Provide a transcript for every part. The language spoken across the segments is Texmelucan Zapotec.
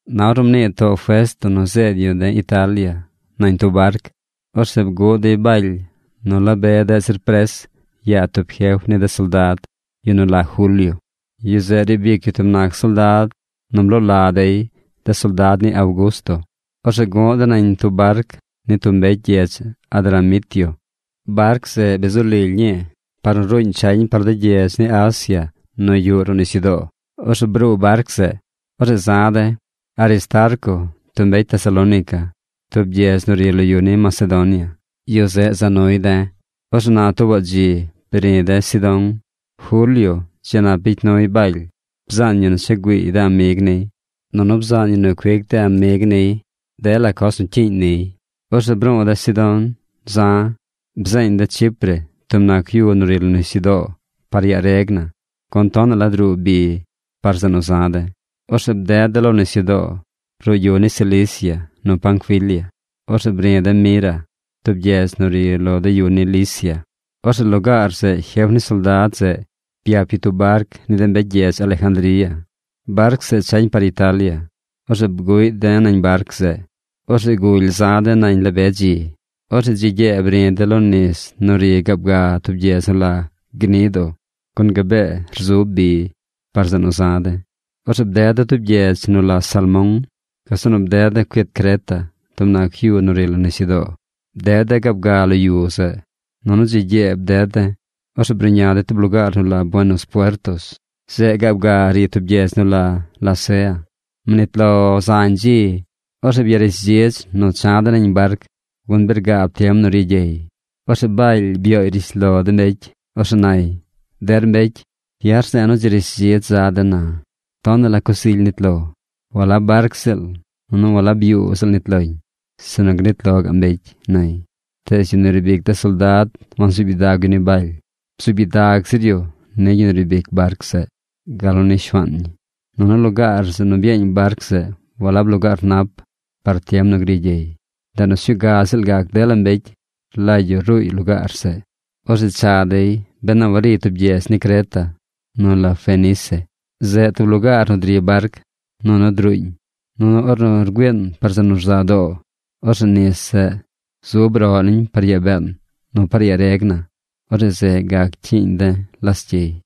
Na ornu mnii too Festo nu zeed yu de̱ Italia nañ tub barc, orzeꞌ bguꞌ dey Baly nu la be deꞌ zir pres yaa tub jef ni de soldad, yu nu la Julio. Yu zeꞌ riib ic yu tub nac soldad nu bloo la dey De Soldad ni Augusto. Orzeꞌ gu̱ꞌ de̱ nañ tub barc ni tub mbecy gyedz Adramitio. Barc zeꞌ bi zu lily ñii par nu ruuñ chañ par de gyedz ni Asia nu yuꞌ ruꞌ nisyudoo. Orzeꞌ bruu barc zeꞌ. Orzeꞌ za̱ de̱. Aristarco, tub mbecy Tesalónica, tub gyedz nu ri lo yu ni Macedonia, yu zeꞌ za nuy de̱. Orzeꞌ na tuubaꞌ dzi bri̱ de̱ Sidón. Julio dzi nap bicy nuy Baly. Bzaan yu nu cha güiiy de amig niy, nunu bzaañ yu nu cuic de amig niy dela coz nu cyiiñ niy. Orzeꞌ bru̱u̱ de̱ Sidón za̱. Bzeeñ de̱ Chipre, tub nac yu nu ri lo nisyudoo, par yaa reg na, gun tonaꞌ la druu bi par zeꞌ nu za de̱. Orzeꞌ bded de̱ lo nisyudoo ruꞌ yu ni Cilicia nu Panfilia. Orzeꞌ bri̱ de̱ Mira, tub gyedz nu ri lo de yu ni Licia. Orzeꞌ lugaar zeꞌ jef ni soldad zeꞌ byap yu tub barc ni de mbecy gyedz Alejandría. Barc zeꞌ chañ par Italia. Orzeꞌ bguꞌy de̱ nañ barc zeꞌ. Orzeꞌ guly za̱ de̱ nañ la be dzi. Orzeꞌ dzi gyee bri̱ de̱ lo nis nu ri gaab ga tub gyedz nu la Gnido, gun gabee rzub bi par zeꞌ nu za̱ de̱. Orzeꞌ bded de̱ tub gyedz nu la Salmón. Gazeꞌ nu bded de̱ cuit Creta, tub nac yu nu ri lo nisyudoo. Bded de̱ gaab ga lo yu zeꞌ, nunu dzi gyee bded de̱. Orzeꞌ bruꞌña de̱ tub lugaar nu la Buenos Puertos. Zeꞌ gaab ga ri tub gyedz nu la Lasea. Mnit lo zañ dzi. Orzeꞌ byarishdzidz nu cha̱ de̱ nañ barc, gun bi rgaab tiem nu ri gyey. Orzeꞌ Baly byooy rishlo de mbecy. Orzeꞌ nay: ―Der mbecy, ya̱ rze̱e̱ nu dzi rishdzidz za̱ den na. Tonaꞌ la coz ily nit lo. Walab barc ziꞌl, nunu walab yuu ziꞌl nit loñ, sinu gnit lo gaꞌ mbecy ―nay. Tees yu nu riib ic de soldad wansuub gyidag yu ni Baly. Bzuub gyidag zir yu ni yu nu riib ic barc zeꞌ, gal nu ni shuaan ñi. Nunu lugaar zeꞌ nu byeeñ barc zeꞌ walab lugaar nap par tiem nu gri gyey. Ndeꞌ nu sñuu ga ziꞌl gac dela mbecy rlagy yu ruuy lugaar zeꞌ. Orzeꞌ cha dey ben a wariy tub gyedz ni Creta nu la Fenice. Zeꞌ tub lugaar nu dri barc, nunu druuñ. Nunu ornu rgüiin par zeꞌ nu rza doo, orzeꞌ nis zeꞌ zub roꞌ niñ par yaa been nu par yaa reg na. Orzeꞌ zeꞌ gac cyiiñ de̱ lascyey.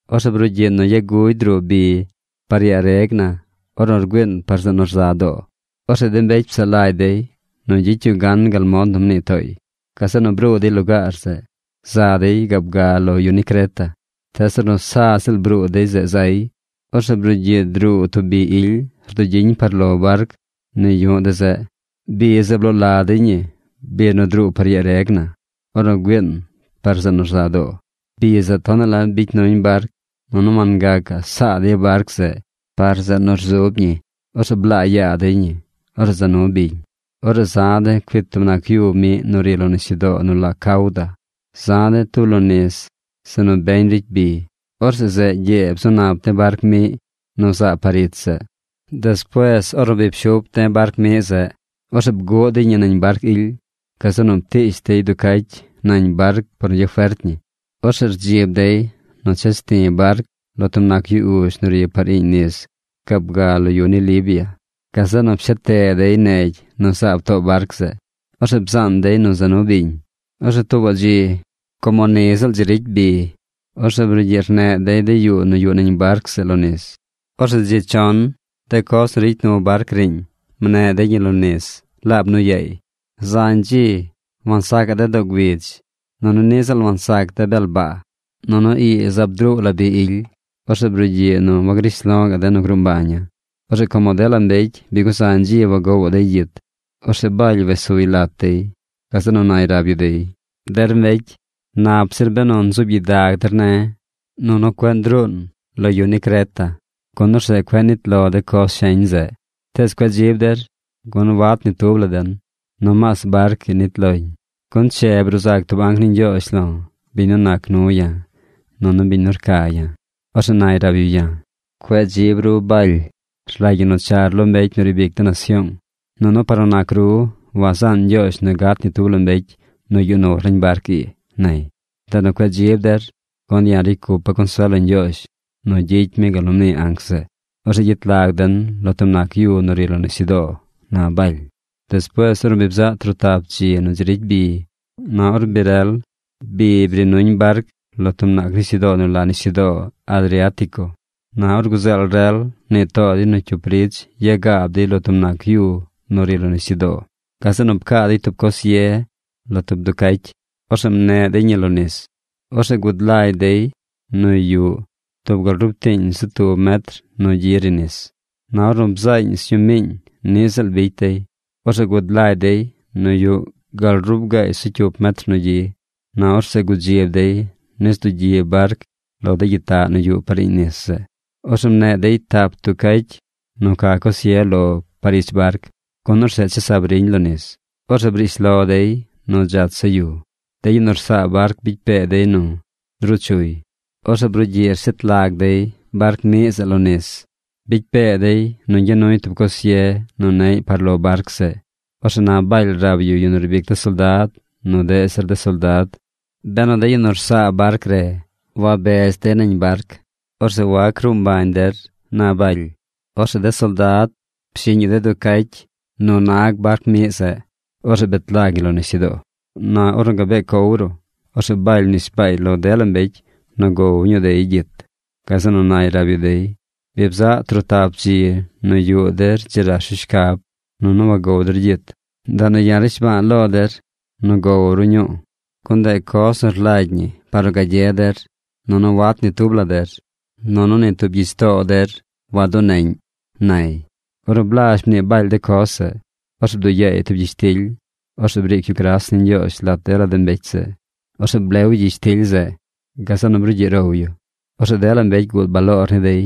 Orzeꞌ brugyiꞌ nu yagugy druu bi par yaa reg na ornu rgüiin par zeꞌ nu rza doo. Orzeꞌ de mbecy psaꞌ lagy dey nu gyicy yu gan gal mod nu mnii tooy. Gazeꞌ nu bruu dey lugaar zeꞌ, za dey gaab ga lo de yu ni Creta. Tees ornu sa ziꞌl bruu dey zeꞌ zay, orzeꞌ brugyiꞌ druu tub bi ily rdugyiñ par lo barc nu yu̱ꞌ de̱ zeꞌ. Bi zeꞌ bloo la dey ñi Bi nu Druu Par Yaa Reg Na Ornu Güiin Par Zeꞌ nu Rza Doo. Bi zeꞌ tonaꞌ la bicy nuñ barc, nunu wangacaꞌ saa dey barc zeꞌ par zeꞌ nu rdugyiñ. Orzeꞌ blaa yaa dey ñi. Orzeꞌ za nu biñ. Orzeꞌ za̱ de̱ cuit tub nac yu miꞌ nu ri lo nisyudoo nu la Cauda. Za̱ de̱ tub lo nis zeꞌ nu beñ ricy bi. Orzeꞌ zeꞌ gyee bzu nap de̱ barc miꞌ nu zaab par ich zeꞌ. Despuees ornu bi pshup de̱ barc miꞌ zeꞌ, orzeꞌ bguꞌ dey ñi nañ barc ily. Gazeꞌ nu ptiish dey duu cacy nañ barc par nu gyafert ñi. Orzeꞌ rdzib dey nu ches ti̱ barc lo tub nac yu uzh nu ri par iiñ nis gaab ga lo yu ni Libia. Gazeꞌ nu pshet te dey negy nu zaab too barc zeꞌ. Orzeꞌ bzaan dey nu za nu biñ. Orzeꞌ tuubaꞌ dzi, como ni ziꞌl dzi ricy bi, orzeꞌ brugyiꞌ rneꞌ dey de yuu nu yuꞌ nañ barc zeꞌ lo nis. Orzeꞌ dzi chon de coz nu ricy nu barc riiñ mneꞌ dey ñi lo nis laab nu yaay. Zañ dzi wansaca̱ꞌ de̱ doo güidz, nunu niꞌ ziꞌl wansac de̱ bel baa. Nunu ii zaab druu la bi ily. Orzeꞌ brugyiꞌ nu wagrish lo ga̱ꞌ de̱ nu gruu mbaña̱. Orzeꞌ como dela mbecy bi guzañ dzi wagowaꞌ dey gyit, orzeꞌ Baly wes suy lat dey. Gazeꞌ nu nay rab yu dey: ―Der mbecy, nap zir benu nzuub gyidag der ne̱, nunu cueꞌ ndruun lo yu ni Creta, gun orzeꞌ cueꞌ nnit lo de coz sheñ zeꞌ. Tees cueꞌ dzib der, gun wat ni tub la den. Nomaas barc ii nit loñ. Gun che bruu zac tub anc ni Ñgyoozh lo̱, biñ nu nac nu ya̱, nunu biñ nu ya̱ rca̱. Orzeꞌ nay rab yu ya̱: “Cueꞌ dzib ru Baly. Rlagy ñi nu char lo mbecy nu riib ic de nasyoong. Nunu par nu nac ru, wazaan Ñgyoozh nu gat ni tub mbecy nu yuꞌ nur nañ barc ii”, nay. Ndeꞌ nu cueꞌ dzib der, gun ya̱ ricy cupa̱ consuel lo Ñgyoozh nu gyicy mi gal nu mnii anc zeꞌ. Orzeꞌ gyet lag den lo tub nac yu nu ri lo nisyudoo ―na Baly. Despuees ornu bzaꞌ trotap dzi nu dzi ricy bi, na or bi rel, bi bri nuñ barc lo tub nisyudoo nu la Nisyudoo Adriatico. Na or guzeel rel mnii too dey nu cyup ridz yagaab dey lo tub nac yu nu ri lo nisyudoo. Gazeꞌ nu pcaa dey tub coz ye lo tub duu cacy. Orzeꞌ mneꞌ dey ñi lo nis. Orzeꞌ gud lagy dey nu yuꞌ tub gal rub tiiñ zu tub metr nu gyi ri nis. Na ornu bzaañ sñuu miiñ, niꞌ ziꞌl bicy dey. Orzeꞌ gud lagy dey nu yuꞌ gal rub gaay zu cyup metr nu gyi. Na orzeꞌ gudzib dey nis dugyi barc lo de gyitaꞌ nu yuꞌ par iiñ nis zeꞌ. Orzeꞌ mneꞌ dey tap duu cacy nu ca coz ye lo par ich barc, gun orzeꞌ chesab riñ lo nis. Orzeꞌ brish lo dey nu dzach zaꞌ yu. De yu nu rsaa barc bicy pee dey nu ndruu chuy. Orzeꞌ brugyiꞌ rshet lag dey barc miꞌ zeꞌ lo nis. Bicy pee dey nu ñgya nuy tub coz ye nu neꞌy par lo barc zeꞌ. Orzeꞌ na Baly rab yu yu nu riib ic de soldad, nu deꞌ zir de soldad: ―Benu de yu nu rsaa barc re wabez dey nañ barc, orzeꞌ wac ruu mbañ der ―na Baly. Orzeꞌ de soldad pshiꞌñ yu de duu cacy nu nag barc miꞌ zeꞌ. Orzeꞌ bet lag ñi lo nisyudoo. Na ornu gabee cow ruꞌ, orzeꞌ Baly mnishbaay lo dela mbecy nu gow dey ñuu gyit. Gazeꞌ nu nay rab yu dey: ―Bi bzaꞌ trotap dzi nu yuꞌ der dzi rash ru shcab, nunu wangow der gyit. Ndeꞌ nu ya̱ rnishba̱a̱ lo der nu gow ru ñuu. Gun ndeꞌ coz nu rlagy ñi par nu gagye der. Nunu wat ni tub der, nunu ni tub gyich too der waduneꞌñ ―nay. Ornu blazh mnii Baly de coz zeꞌ, orzeꞌ bduꞌ yaay tub gyishtily. Orzeꞌ briic yu gras ni Ñgyoozh lat dela mbecy zeꞌ. Orzeꞌ blew yu gyishtily zeꞌ. Gazeꞌ nu brugyiꞌ row yu. Orzeꞌ dela mbecy guud baloor ni dey,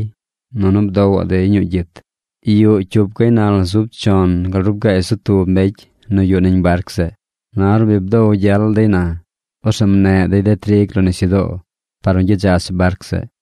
nunu bdowaꞌ dey ñuu gyit. Yuꞌ cyup gaynal zub chon gal rub gaay zu tub mbecy nu yuꞌ nañ barc zeꞌ. Na ornu bi bdow gyel dey na, orzeꞌ mneꞌ dey de trig lo nisyudoo par nu gyadzach barc zeꞌ.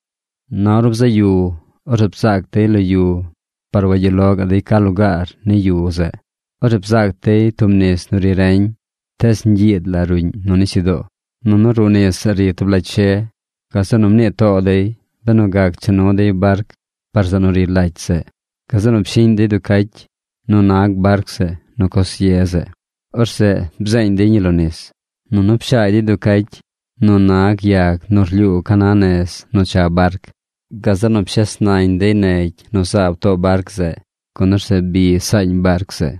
Na ornu bzaꞌ yu, orzeꞌ bzaac dey lo yu par wagyuꞌ lo gaꞌ dey ca lugaar ni yu zeꞌ. Orzeꞌ bzaac dey tub nis nu ri reñ, tees ñgyiid la ruꞌñ nu nisyudoo. Nunu ruꞌ nis zeꞌ ri tub lacy she. Gazeꞌ nu mnii too dey benu gac cha nu dey barc par zeꞌ nu ri lacy zeꞌ. Gazeꞌ nu pshiꞌñ dey duu cacy nu nag barc zeꞌ nu coz ye zeꞌ. Orzeꞌ bzeeñ dey ñi lo nis. Nunu pshaagy dey duu cacy nu nag yag nu rlyuu ca na nez nu cha barc. Gazeꞌ nu pshes nañ dey negy nu zaab too barc zeꞌ, gun orzeꞌ bi saañ barc zeꞌ.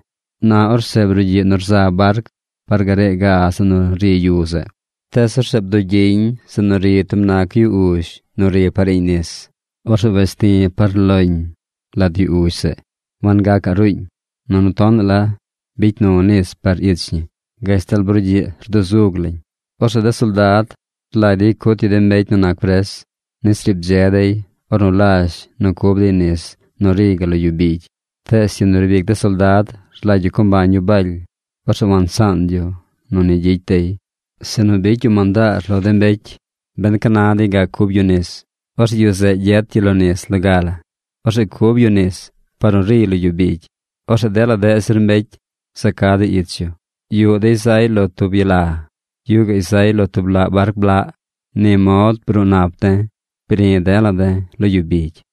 Na orzeꞌ brugyiꞌ nu rza barc par garee ga zeꞌ nu ri yu zeꞌ. Tees orzeꞌ bdugyiñ zeꞌ nu ri tub nac yu uzh nu ri par iiñ nis. Orzeꞌ wes ti̱ par loñ lat yu uzh zeꞌ. Wangacaꞌ ruuñ. Nunu tonaꞌ la bicy nu nis par ich ñi, gashtal brugyiꞌ rduzug lañ. Orzeꞌ de soldad rlagy dey cut yu de mbecy nu nac pres nis riib dze dey ornu lazh nu cub dey nis nu riy gal lo yu bigy. Tees yu nu riib ic de soldad rlagy yu co mbañ yu Baly. Orzeꞌ wansaan yu nu ni gyicy dey. Sinu bicy yu mandaar lo de mbecy ben ca na dey gac cub yu nis, orzeꞌ yu zeꞌ gyet yu lo nis loga la. Orzeꞌ cub yu nis par nu riy lo yu bigy. Orzeꞌ dela deꞌ zir mbecy za ca dey ich yu. Yuꞌ dey zay lo tub yala. Yuꞌ gaꞌy zay lo tub laꞌ barc blaꞌ. Ni mod bruu nap de̱. Bri̱ de̱la̱ de̱ lo yu bigy.